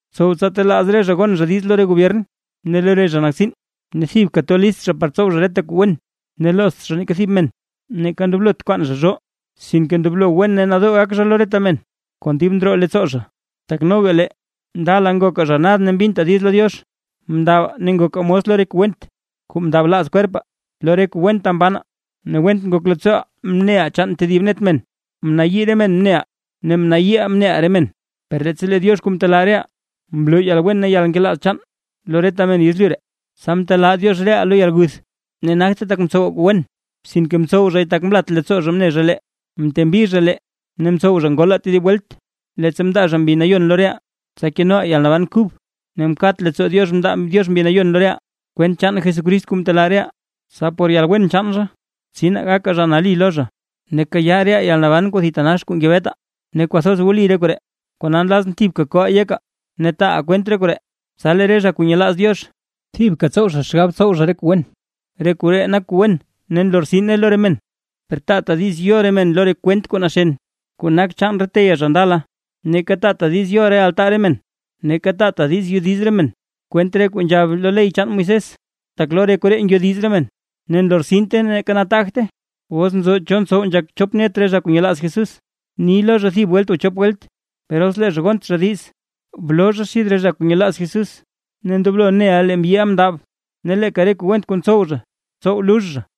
Btsow tsa telaaz re zha gon zha diiz lo re gobyern ne lo re zha nak tsiin, ne thibka to list zha par tsow zha reta kuu wen, ne loozt zha neeka thib men, neeka ndoblot kwaan zha zhoo, sinke ndoblo wen ne nadoo gak zha lo reta men kon dib ndroo leettsoo zha. Tak noga lee ndala ngokaa zha nad mbintaa diiz lo Diox, mndabaa ne ngokaa mos lo re kuu went kuu mndablaaz kwerpaa, lo re kuu wenta mbanaa ne went ngok leettsooʼaa mneʼaa chaan tedib net men; mnayii re men mneʼaa, ne mnayiiʼaa mneʼaa re men. Per leettsa lee Diox kuu mtelaa reʼaa, mloo yalwen ne yalnkelaaz chaan lo reta men yezlyu ree, tsa mtelaa Diox reʼaa lo yalguth, ne nagte tak mtsowaa kuu wen, sinke mtsow zhay tak mlat leettsoo zha mne zha lee. Mtembi zha lee ne mtsow zha ngolaa tedib welt, leettsa mndaa zha Mbi Nayon lo reʼaa, tsa kenoʼaa yalnaban kub, ne mkat leettsoo Diox mndaa Diox Mbi Nayon lo reʼaa kwent chaan Jesucrist kuu mtelaa reʼaa, tsa por yalwen chaan zha, tsinaa gakaa zha nali lo zha, ne kayaa reʼaa yalnaban kuu thitanax kuu ngebetaa. Ne kwathoz wli re koree, kona nlazʼn thibka ko yeka taaʼa kwent re koree, tsa lee re zha kuu nyelaaz Diox thibka tsow zha xgab tsow zha re kuu wen. Re koree nak kuu wen ne nlortsine lo re men. Per taata diiz yo re men lo re kwent kuu naxen, kuu nak chaan re teyaa zha ndala, neeka taata diiz yo re altaa re men, neeka taata diiz yodiz re men kwent re kuu nzhab lo ley chaan Moisés. Tak lo re koree ngyodiz re men ne nlortsinte neeka nataagte. Os nzo cho ntsow nzhak chop net re zha kuu nyelaaz Jesús, bni lo zha thib welt o chop welt; per os lee zha gont zha diiz, bloo zha xid re zha kuu nyelaaz Jesús. Ne ndoblo neʼa lee mbyiʼa mndab, ne leeka re kuu went kuu ntsow zha, tsow lux zha.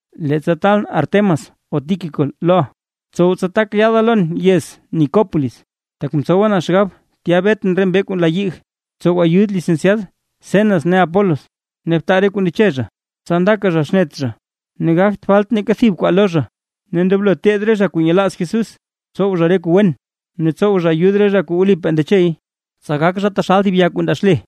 Leettsa taalʼn Artemas o Tíquico loʼa, btsow tsa tak yaada lon yez Nicópolis, tak mtsowa na xgab tya betʼn re mbee kuu nla yig. Btsow ayud Lisenciad Zenas ne Apolos, ne btaa re kuu ndeche zha, tsa ndaka zha xnet zha ne gagt falt neeka thib kwaa lo zha. Ne ndoblo teed re zha kuu nyelaaz Jesús, tsow zha re kuu wen ne tsow zha ayud re zha kuu wlipaa ndechey, tsa gak zha taxal thib ya kuu ndaa xle.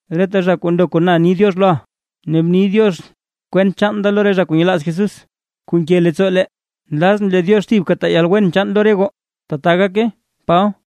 Reta zha kuu ndo kon na ni “diox” loʼa. Ne bni “diox” kwent chaan da lo re zha kuu nyelaaz Jesús kuu nke leettsoo lee. Nlazʼn lee Diox thibka taa yalwen chaan lo re goo. ¡Tbaa gake! Paba